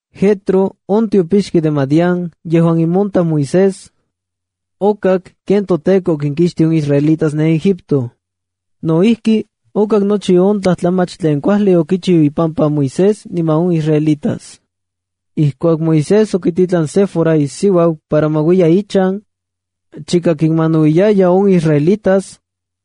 Jetro, on tiopixki de Madián yejuan imontaj Moisés, okak ken toTEKO okinkixtij on israelitas ne Egipto. No ijki, okak nochi on tlajtlamach tlen kuajli okichiu ipampa Moisés niman on israelitas. Ijkuak Moisés okititlan Séfora isiuau para ma uiya ichan, chika kinmanauiyaya on israelitas,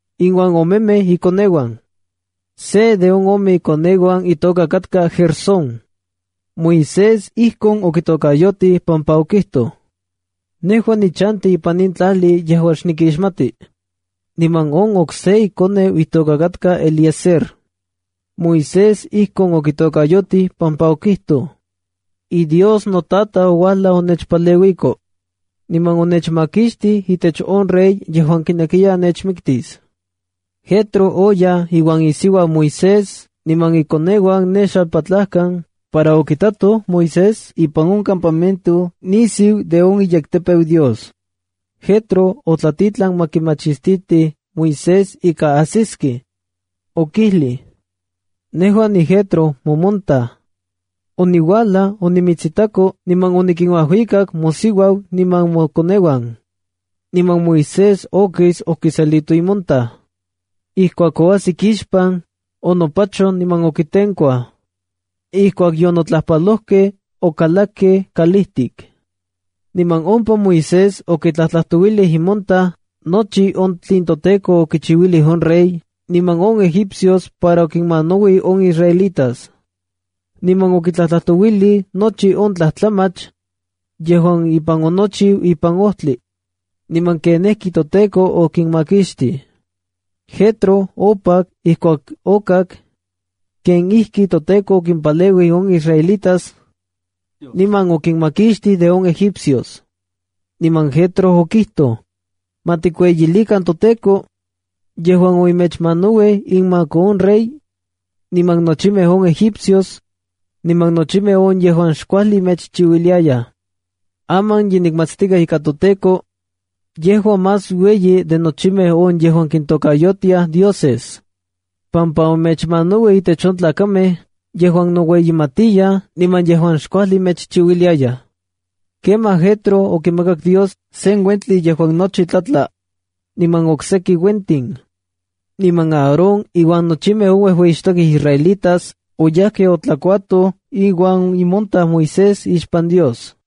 iuan omemej ikoneuan. Se de on ome ikoneuan itoka katka Gersóna. Moisés ijkon okitokayotij pampa okijtoj: “Nejua nichanti ipan in tlajli yejuan xnikixmati”. Niman on okse ikoneu itoka katka Eliezer. Moisés ijkon okitokayotij pampa okijtoj: “IDios notataj ouajlaj onechpaleuiko, niman onechmakixtij itech on rey yejuan kinekiya nechmiktis.” Jetro oyaj iuan isiuau Moisés niman ikoneuan ne xalpatlajkan para okitatoj Moisés ipan on campamento nisiu de on iyektepeu Dios. Jetro otlatitlan ma kimachistitij Moisés ika ajsiskej. Okijlij: —Nejua niJetro, momontaj. Oniuajlaj onimitsitako niman onikinuajuikak mosiuau niman mokoneuan. Niman Moisés okis okiselito imontaj. Ijkuak oajsik ixpan, onopachoj niman okitenkuaj. Ijkuak yonotlajpalojkej, okalakkej kalijtik. Niman ompa Moisés okitlajtlajtouilij imontaj nochi on tlen toTEKO okichiuilij on rey niman on egipcios para okiminmanauij on israelitas. Niman okitlajtlajtouilij nochi on tlajtlamach yejuan ipan onochiu ipan ojtli, niman kenijkitoTEKO okinmakixtij. Jetro opak ijkuak okak ken ijkitoTEKO okimpaleuij on israelitas niman okinmakixtij de on egipcios. Niman Jetro okijtoj: —Ma tikueyilikan toTEKO yejuan omechmanauij inmak on rey niman nochimej on egipcios, niman nochimej on yejuan xkuajli mechchiuiliayaj. Aman ye nikmatstikaj ika toTEKO yejua más ueyi de nochimej on yejuan kintokayotiaj dioses, pampa omechmanauij intech on tlakamej yejuan noueyimatiyaj niman yejuan xkuajli mechchiuiliayaj. Kemaj Jetro okimakak Dios sen uentli yejuan nochi tlatla, niman okseki uentin. Niman Aarón iuan nochimej on uejueyixtokej israelitas oyajkej otlakuatoj iuan imontaj Moisés ixpan Dios.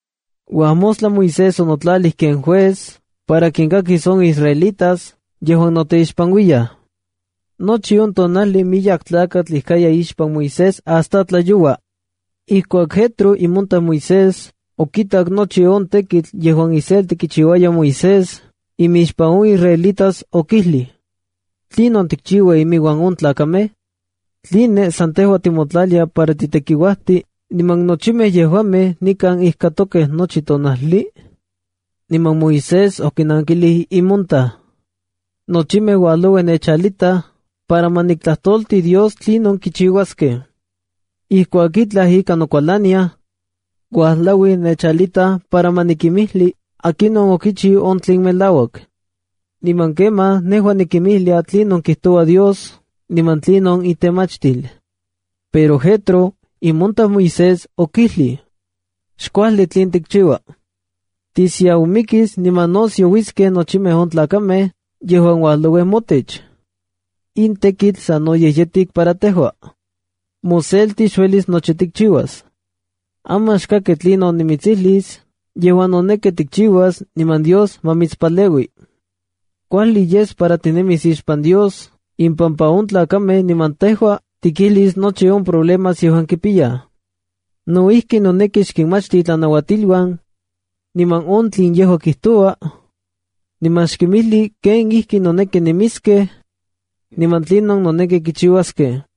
Uajmostla Moisés onotlalij ken juez para kinkakis on israelitas yejuan noteixpanuiyaj. Nochi on tonajli miyek tlakatl ijkaya ixpan Moisés hasta tlayoua. Ijkuak Jetro imontaj Moisés okitak nochi on tekitl yejuan iselti kichiuaya Moisés imixpan on israelitas, okijlij: —¿Tlinon tikchiua iminuan on tlakamej? ¿Tline san tejua timotlalia para titekiuajti niman nochimej yejuamej nikan ijkatokej nochi tonajli? Niman Moisés okinankilij imontaj: —Nochimej uajlauij nechalitaj para ma niktlajtolti Dios tlinon kichiuaskej. Ijkuak itlaj ika nokualaniaj, uajlauij nechalitaj para ma nikinmijli akinon okichiu on tlen melauak. Niman kemaj nejua nikinmijlia tlinon kijtoua Dios niman tlinon itemachtil. Pero Jetro, imontaj Moisés, okijlij: Xkuajli tlen tikchiua. Tisiaumikis niman no siauiskej nochimej on tlakamej yejuan uajlauij motech. In tekitl sanoyej yetik para tejua. Moselti xuelis nochi tikchiuas. Aman xkaki tlinon nimitsijlis yejuan noneki tikchiuas niman Dios ma mitspaleui. Kuajli yes para tinemis ixpan Dios impampa on tlakamej niman tejua tikijlis nochi on problemas yejuan kipiyaj. No ijki, noneki xkinmachti itlanauatiluan, niman on tlen yejua kijtoua, niman xkinmijli kenijkinoneki nemiskej, niman tlinon noneki kichiuaskej.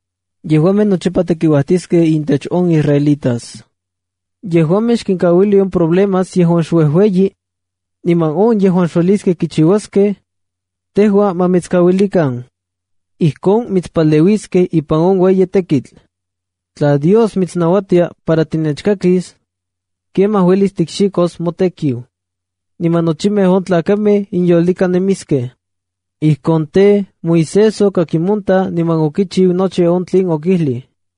Yejuamej nochipa tekiuajtiskej intech on israelitas. Yejuamej xkinkauili on problemas yejuan xuejueyi, niman on yejuan xueliskej kichiuaskej, tejua ma mitskauilikan. Ijkon mitspaleueliskej ipan on ueyi tekitl. Tla Dios mitsnauatia para tinechkakis, kemaj uelis tikxikos motekiu, niman nochimej on tlakamej inyolika nemiskej. Ijkon tej, Moisés okak imontaj niman okichiu nochi on tlen okijlij.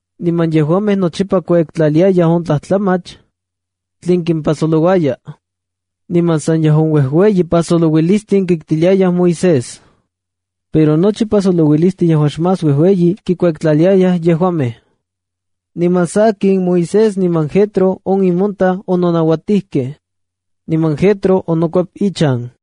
Niman yejuamej nochipa kuektlaliayaj on tlajtlamach tlen kimpajsolouaya. Niman san yejuan uejueyi pajsolouilistin kiktiliayaj Moisés, pero nochi pajsolouilistli yejuan xmás uejueyi kikuektlaliayaj yejuamej. Niman sakin, Moisés niman Jetro on imontaj ononauatijkej, niman Jetro onokuep ichan.